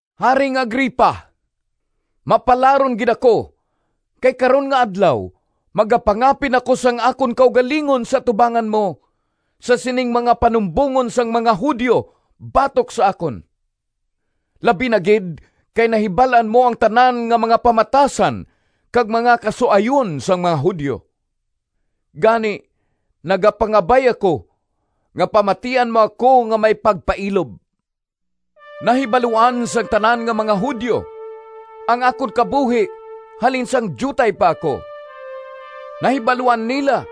“Haring Agripa! Mapalaron gid ako kay karon nga adlaw magapangapin ako sang akon kaugalingon sa atubangan mo, sa sining mga panumbongon sang mga Judio batok sa akon, labi na gid kay nahibal-an mo ang tanan nga mga pamatasan kag mga kasuayon sang mga Judio. Gani, nagapangabay ako nga pamatian mo ako nga may pagpailob. “Nahibaluan sang tanan nga mga Judio ang akon kabuhi halin sang diutay pa ako. Nahibaluan nila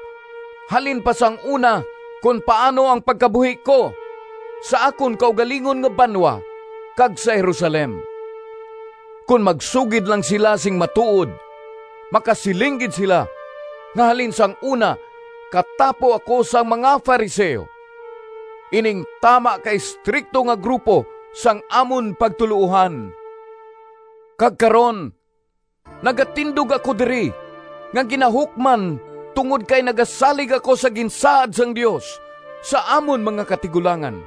halin pa sang una kon paano ang pagkabuhi ko sa akon kaugalingon nga banwa kag sa Jerusalem. Kon magsugid lang sila sing matuod, makasiling gid sila nga halin sang una katapo ako sang mga Fariseo, ining tama ka estrikto nga grupo sang amon pagtuloohan. Kag karon nagatindog ako diri nga ginahukman tungod kay nagasalig ako sa ginsaad sang Dios sa amon mga katigulangan,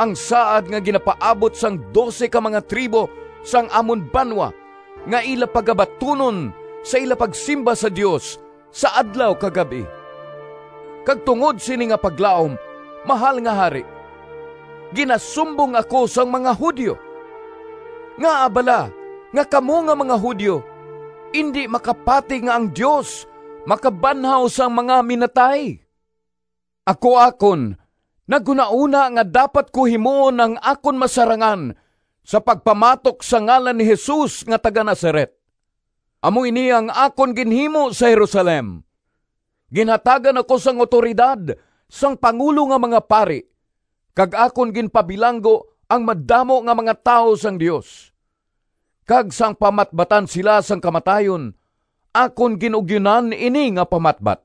ang saad nga ginapaabot sang dose ka mga tribo sang amon banwa nga ila pagabatunon sa ila pagsimba sa Dios sa adlaw kag gab-i. Kag tungod sini nga paglaom, Mahal nga Hari, ginasumbong ako sang mga Judio! Ngaa bala nga kamo nga mga Judio indi makapati nga ang Dios makabanhaw sang mga minatay? “Ako akon naghunahona nga dapat ko himuon ang akon masarangan sa pagpamatok sa ngalan ni Jesus nga taga-Nazaret. Amo ini ang akon ginhimo sa Jerusalem. Ginhatagan ako sang awtoridad sang pangulo nga mga pari, kag akon ginpabilanggo ang madamo nga mga tawo sang Dios. Kag sang pamatbatan sila sang kamatayon, akon gin-ugyonan ini nga pamatbat.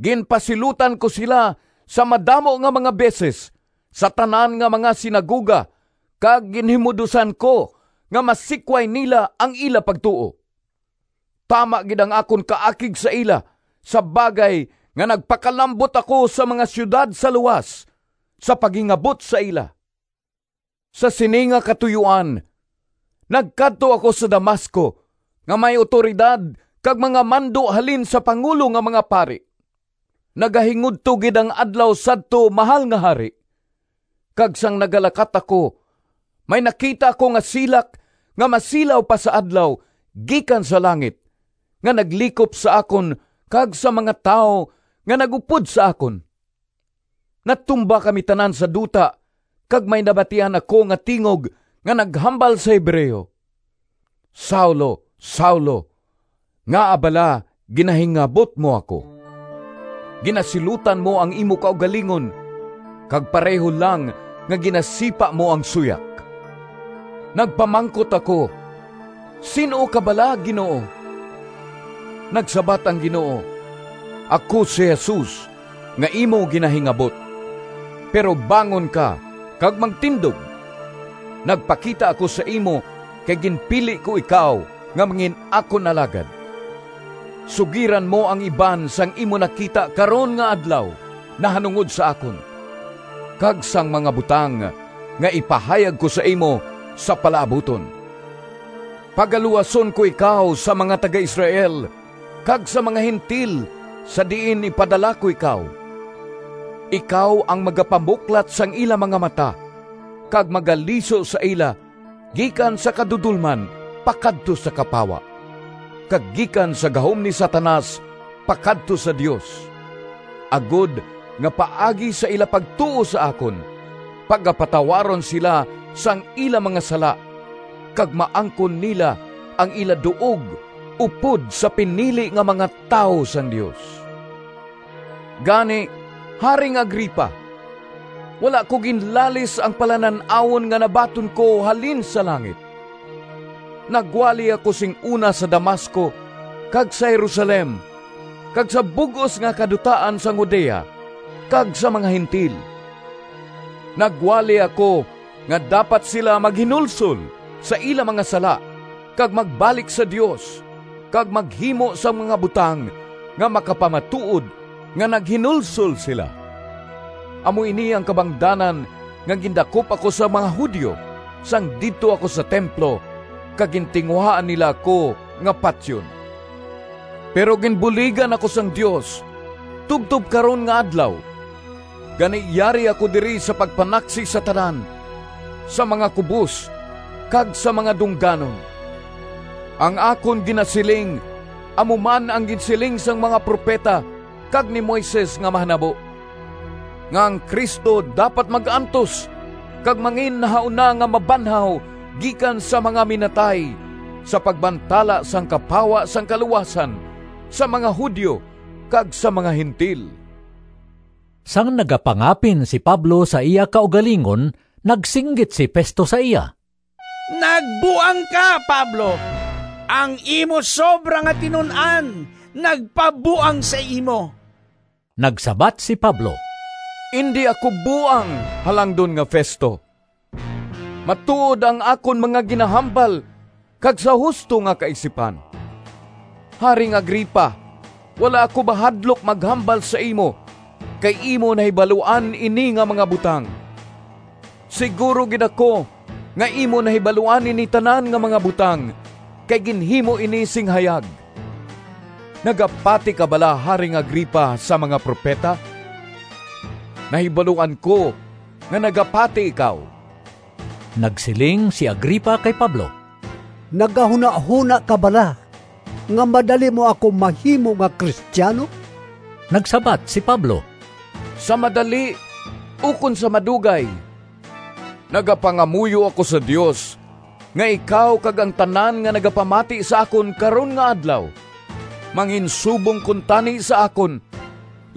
Ginpasilutan ko sila sa madamo nga mga beses sa tanan nga mga sinagoga kag ginhimud-osan ko nga masikway nila ang ila pagtuo. Tama gid ang akon kaakig sa ila sa bagay nga nagpakalambot ako sa mga siyudad sa luwas sa paghingabot sa ila.” “Sa sini nga katuyoan nagkadto ako sa Damasco nga may awtoridad kag mga mando halin sa pangulo nga mga pari. Nagahingudto gid ang adlaw sadto, Mahal nga Hari, kag sang nagalakat ako, may nakita ako nga silak nga masilaw pa sa adlaw gikan sa langit nga naglikop sa akon kag sa mga tawo nga nag-upod sa akon. Natumba kami tanan sa duta kag may nabatian ako nga tingog nga naghambal sa Hebreo, ‘Saulo, Saulo! Ngaa bala ginahingabot mo ako? Ginasilutan mo ang imo kaugalingon kag pareho lang nga ginasipa mo ang suyak.’ Nagpamangkot ako, ‘Sin-o ka bala, Ginoo?’ Nagsabat ang Ginoo, ‘Ako si Jesus, nga imo ginahingabot. Pero bangon ka kag magtindog. Nagpakita ako sa imo kay ginpili ko ikaw nga mangin-akon alagad. Sugiran mo ang iban sang imo nakita karon nga adlaw nahanungod sa akon, kag sang mga butang nga ipahayag ko sa imo sa palaabuton. Pagaluwason ko ikaw sa mga taga-Israel kag sa mga Gentil sa diin ipadala ko ikaw. Ikaw ang magapamuklat sang ila mga mata kag magaliso sa ila gikan sa kadudolman pakadto sa kapawa, kag gikan sa gahom ni Satanas pakadto sa Dios, agod nga paagi sa ila pagtuo sa akon, pagapatawaron sila sang ila mga sala kag maangkon nila ang ila duog upod sa pinili nga mga tawo sang Dios.’” “Gani, Haring Agripa, wala ko ginlalis ang palanan-awon nga nabaton ko halin sa langit. Nagwali ako sing una sa Damasco kag sa Jerusalem kag sa bug-os nga kadutaan sang Judea kag sa mga Gentil. Nagwali ako nga dapat sila maghinulsol sa ila mga sala kag magbalik sa Dios kag maghimo sang mga butang nga makapamatuod nga naghinulsol sila. Amo ini ang kabangdanan nga gindakop ako sang mga Judio sang didto ako sa templo kag gintinguhaan nila ako nga patyon. Pero ginbuligan ako sang Dios tubtob karon nga adlaw, gani yari ako diri sa pagpanaksi sa tanan, sa mga kubos kag sa mga dungganon. Ang akon ginasiling amo man ang ginsiling sang mga propeta kag ni Moises nga mahanabo, nga ang Cristo dapat mag-antos kag manginnahauna nga mabanhaw gikan sa mga minatay sa pagbantala sang kapawa sang kaluwasan sa mga Judio kag sa mga Gentil.” Sang nagapangapin si Pablo sa iya kaugalingon, nagsinggit si Festo sa iya, “Nagbuang ka, Pablo! Ang imo sobra nga tinun-an nagpabuang sa imo!” Nagsabat si Pablo, “Indi ako buang, Halangdon nga Festo! Matuod ang akon mga ginahambal kag sa husto nga kaisipan. Haring Agripa! Wala ako mahadlok maghambal sa imo kay imo nahibaluan ini nga mga butang. Siguro gid ako nga imo nahibaluan ini tanan nga mga butang kay ginhimo ini sing hayag. Nagapati ka bala, Haring Agripa, sa mga propeta? Nahibaluan ko nga nagapati ikaw!” Nagsiling si Agripa kay Pablo, “Nagahunahona ka bala nga madali mo ako mahimo nga Cristiano?” Nagsabat si Pablo, “Sa madali ukon sa madugay, nagapangamuyo ako sa Dios nga ikaw kag ang tanan nga nagapamati sa akon karon nga adlaw, manginsubong kuntani sa akon,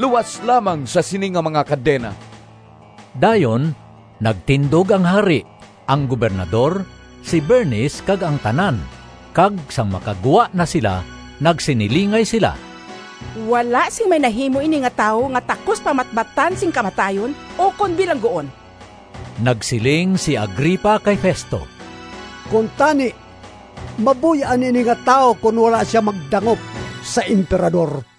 luas lamang sa sini nga mga kadena!” Dayon nagtindog ang Hari, ang Gobernador, si Bernice kag ang tanan, kag sang makagwa na sila nagsinilingay sila, “Wala sing may nahimo ini nga tawo nga takos pamatbatan sing kamatayon ukon bilangguon.” Nagsiling si Agripa kay Festo, “Kuntani mabuy-an ini nga tawo kon wala sia magdangop sa Emperador.”